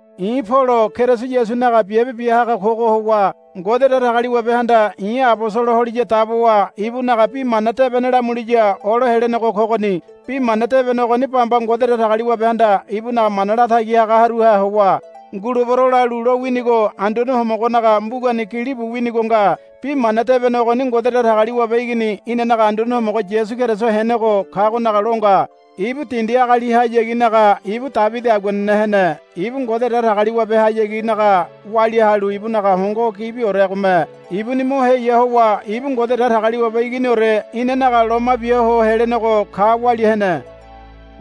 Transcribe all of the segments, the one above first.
I̱ Polo Keriso Yasunaga biabe bia haga kogo howa Ngode Datagaliwabehanda i̱ abosolo holiya dabowa ibunaga Bi Mana Debene lamuliya olo helenego kogoni. Bi Mana Debene ogoni bamba Ngode Datagaliwabehanda ibunaga mana latagi hagaruha howa, Ngulebero, lalu lowinigo Anduane Homogonaga mbugani gilibu winigo nga. Bi Mana Debene ogoni Ngode Datagaliwabe Igini inanaga Anduane Homogo Yasu Keriso henego kagonaga lo nga. Ibu dindi agalihayaginaga ibu Debidi aguanene hene. Ibu Ngode Datagaliwabe hayaginaga walia halu ibunaga hongo gibioregome ibuni mo heya howa ibu Ngode Datagaliwabe Iginiore inanaga loma biaho helenego ka walia hene.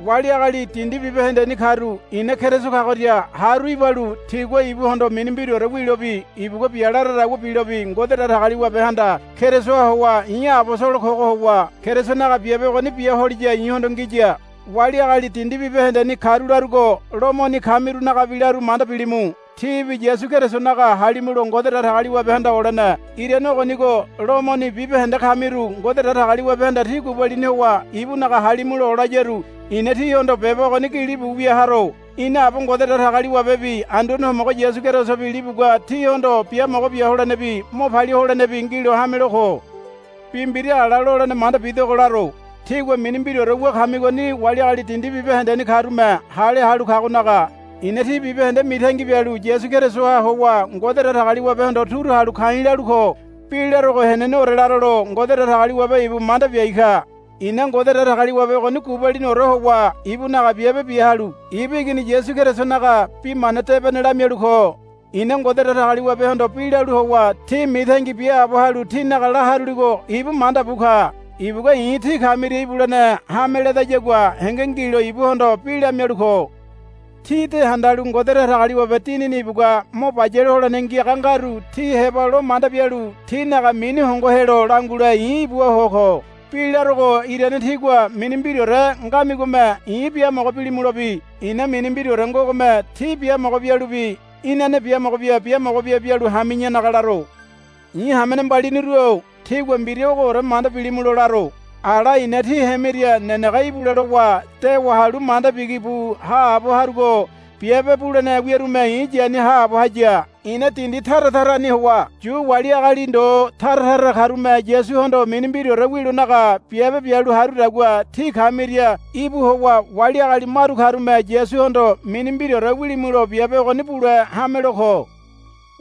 Wali agali dindi bibahendeni karu i̱na Keriso kagoria haru ibalu tigua ibuhondo mini mbiraore wilobi ibugua bia laradagua bilobi Ngode Datagaliwabehanda Kerisoha howa i̱ abosolo kogo howa Kerisonaga biabe ogoni bia holiya i̱hondo ngiya. Wali agali dindi bibahendeni karu larugo Lomoni kamirunagabi laru manda bilimu. Tíbi Yasu Kerisonaga halimulo Ngode Datagaliwabehanda olene. Irane ogonigo Lomoni bibahende kamiru Ngode Datagaliwabehanda tí gubalini howa ibunaga halimulo olayaru i̱na tíhondo beba ogoni gilibu wia haro. Ina Aba Ngode Datagaliwabebi Anduane Homogo Yasu Kerisobi libugua tíhondo biamogo bia holenebi mo palia holenebi ngilo hamelo ko. Bi mbira ala lolene manda bidogo laro. Tígua mini mbiraore wu kamigoni wali agali dindi bibahendeni karume hale halu kagonaga i̱na tí bibahende mitangi bialu Yasu Kerisoha howa Ngode Datagaliwabehondo turu halu ka̱i̱ lalu ko. Bi larogo heneneore laralo Ngode Datagaliwabe ibu manda biai ka. I̱na Ngode Datagaliwabe ogoni gubaliniore howa ibunaga biabe bia halu ibu Igini Yasu Kerisonaga Bi Mana Debene lamialu ko. I̱na Ngode Datagaliwabehondo bi lalu howa tí mitangi biaabo halu tínaga la haruligo ibu manda bu ka. Ibugua i̱ tí kamiria ibulene hame ledayagua henge ngilo ibuhondo bi lamialu ko. Tí de handalu Ngode Datagaliwabe Dinini ibugua mo bayale holene ngiaga ngaru tí heba lo manda bialu tínaga mini hongo helo langule i̱ ibua ho ko. Bi larogo irane tígua mini mbiraore ngamigome i̱ biamogo bilimulobi i̱na mini mbiraore ngogome tí biamogo bialubi inane biamogo bia biamogo bia bialu hami̱yanaga laro. I̱ hamene mbaliniru-o tígua mbira ogoore manda bilimulo laro. Ala i̱na tí hemiria nenege ibule lowa dewa halu manda bigi bu haabo harugo biabe bulene wiarume i̱ yani haabo haya. I̱na dindi tara tarani howa Yu wali agali ndo tara tara karume Yasuhondo mini mbiraore wilonaga biabe bialu harudagua tí kamiria íbu howa wali agali maru karume Yasuhondo mini mbiraore wilimulo biabe ogoni bule hamelo ko.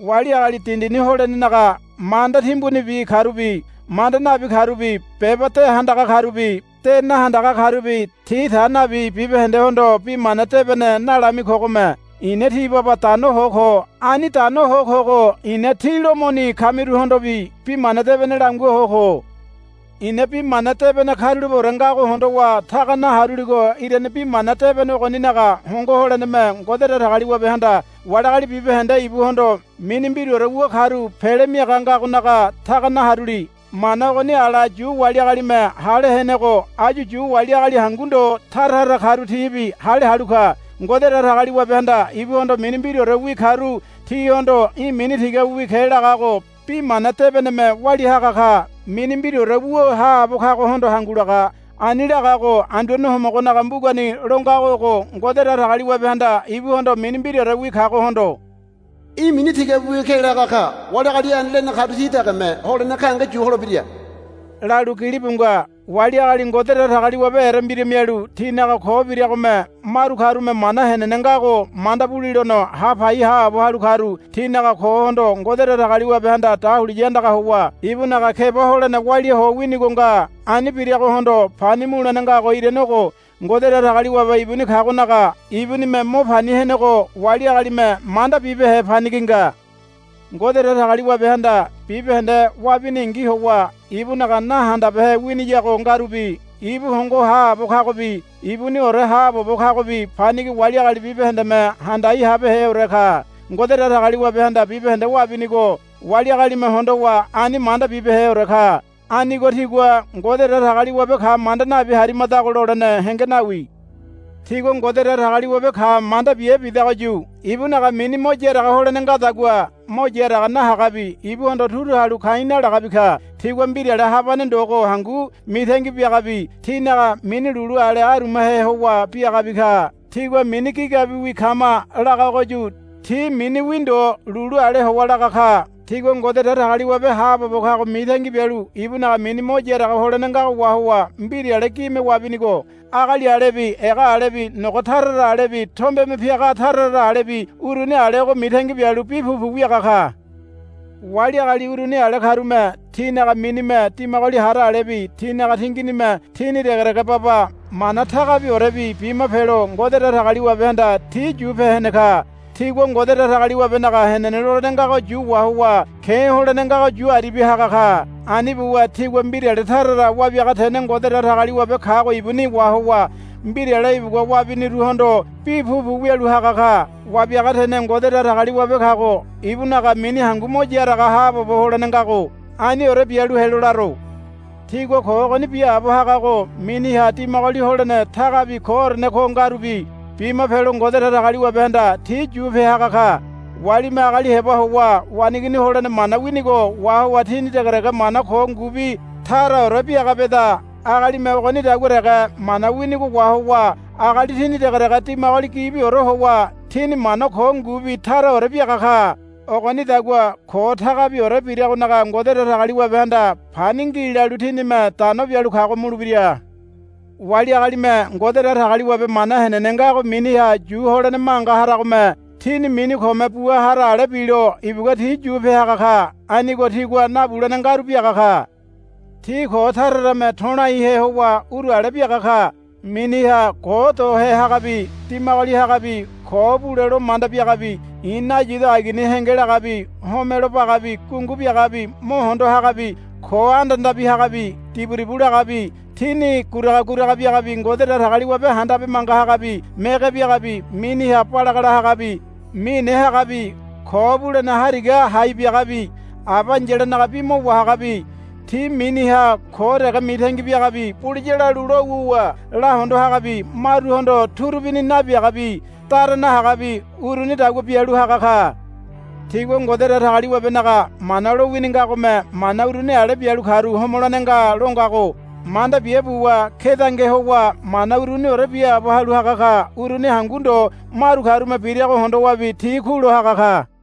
Wali agali dindini holenenaga manda timbunibi karubi manda nabi karubi beba de handaga karubi de nahandaga karubi ti ta nabi bibahendehondo Bi Mana Debene nalami kogome i̱na ti baba dano ho ko. Ani dano ho kogo i̱na tí Lomoni kamiruhondobi Bi Mana Debene langua ho ko. I̱na Bi Mana Debene karulapeore ngago hondowa taga naharuligo irane Bi Mana Debene ogoninaga hongo holeneme Ngode Datagaliwabehanda wali agali bibahende ibuhondo mini mbiraore wu karu pele miaga ngagonaga taga naharuli. Mana ogoni ala Yu wali agalime hale henego áyu Yu wali agali hangu ndo tara tara karu tibi hale halu ka. Ngode Datagaliwabehanda ibuhondo mini mbiraorewi karu tihondo, Í̠ mini tigabiwi ke, lagago Bi Mana Debeneme walia haga ka. Mini mbiraore wu haabo kagohondo hangu laga. Ani lagago Anduane Homogonaga mbugani lo ngago ogo, Ngode Datagaliwabehanda ibuhondo mini mbiraorewi kagohondo, Í̠ mini tigabiwi ke, laga ka. Wali agali ani lene karu ti degeme holene gahenge yu holebira, lalu gilibu nga. Wali agali Ngode Datagaliwabe erembira mialu tinaga ko biragome maru karume mana henene ngago manda bulilono hapai haabo halu karu tinaga kohondo Ngode Datagaliwabehanda dahuliya andaga howa ibunaga keba holene waliaho winigo nga. Ani biragohondo pani mulene ngago irane ogo. Ngode Datagaliwabe ibuni kagonaga ibunime mo pani henego wali agalime manda bibehe panigi nga. Ngode Datagaliwabehanda bibahende wabiningi howa ibunaga nahandabehe winiyago ngarubi ibu hongo haabo kagobi ibuniore haabobo kagobi panigi wali agali bibahendeme handai habeheore ka. Ngode Datagaliwabehanda bibahende wabinigo wali agalime hondowa ani manda bibeheore ka. Anigo tigua, Ngode Datagaliwabe ka manda nabi harimadago, lolene henge nawi. Tigua Ngode Datagaliwabe ka manda bia bidagoyu ibunaga mini mo yaraga holene ngadagua mo yaraga nahagabi ibuhondo turu halu ka̱i̱ nalagabi ka. Tigua mbirale habane ndogo hangu mitangi biagabi tinaga mini lulu ale arumahe howa biagabi ka. Tigua, Mini gigabiwi kama, lagagoyu ti miniwi ndo lulu ale howa laga ka. Tigua Ngode Datagaliwabe haabobo kago mitangi bialu ibunaga mini mo yaraga holene ngago wahowa mbirale gime wabinigo agali alebi ega alebi nogo tara tara alebi tombeme piaga tara tara alebi uruni alego mitangi bialu bi pupu wiaga ka. Wali agali uruni ale karume tinaga minime dimagoli hara alebi tinaga tinginime tini degedege baba mana tagabiorebi bima pelo Ngode Datagaliwabehanda ti yupe hene ka. Tigua Ngode Datagaliwabenaga henene lolene ngago yu wahowa ke̱ holene ngago yu aribia haga ka. Ani buwa tigua mbirale tara tara wabiaga tene Ngode Datagaliwabe kago ibuni wahowa mbirale ibugua wabiniruhondo bi pupu wialu haga ka. Wabiaga tene Ngode Datagaliwabe kago ibunaga mini hangu mo yaraga haabobo holene ngago. Aniore bialu helo laro. Tigua ko ogoni biaabo hagago miniha dimagoli holene tagabi koorene ko ngarubi bima pelo Ngode Datagaliwabehanda ti yupe haga ka. Walime agali heba howa waneigini holene mana winigo wahowa tini degedege mana ko ngubi taraore biaga beda. Agalime ogonidagua dege mana winigo wahowa agali tini degedege dimagoli gibiore howa tini mana ko ngubi taraore biaga ka. Ogonidagua ko tagabiore biragonaga Ngode Datagaliwabehanda pani ngi lalu tinime dano bialu kago mulebira. Wali agalime Ngode Datagaliwabe mana henene ngago miniha yu holene manga haragome tini mini kome bua hara ale bilo ibugua ti yupe haga ka. Anigo tigua nabulene ngaru biaga ka. Ti ko tara tarame to̱laihe howa uru ale biaga ka. Miniha ko dohe hagabi dimagoli hagabi ko bule lo manda biagabi i̱ nayido agini henge lagabi homelo bagabi gungu biagabi mo hondo hagabi ko andandabi hagabi diburibu lagabi tini guraga guraga biagabi Ngode Datagaliwabe handabe manga hagabi mege biagabi miniha balagala hagabi mine hagabi ko bulene hariga hai biagabi aba ai̱yalanaga bi mo wahagabi ti miniha ko dege mitangi biagabi buliya lalu lo wuwa lahondo hagabi maruhondo turubini nabiagabi dara nahagabi urunidagua bialu haga ka. Tigua Ngode Datagaliwabenaga mana lowini ngagome mana uruni ale bialu karu homolene nga lo ngago manda bia buwa kedange howa mana uruniore biaabo halu haga ka. Uruni hangu ndo maru karume birago hondowabi ti kulo haga ka.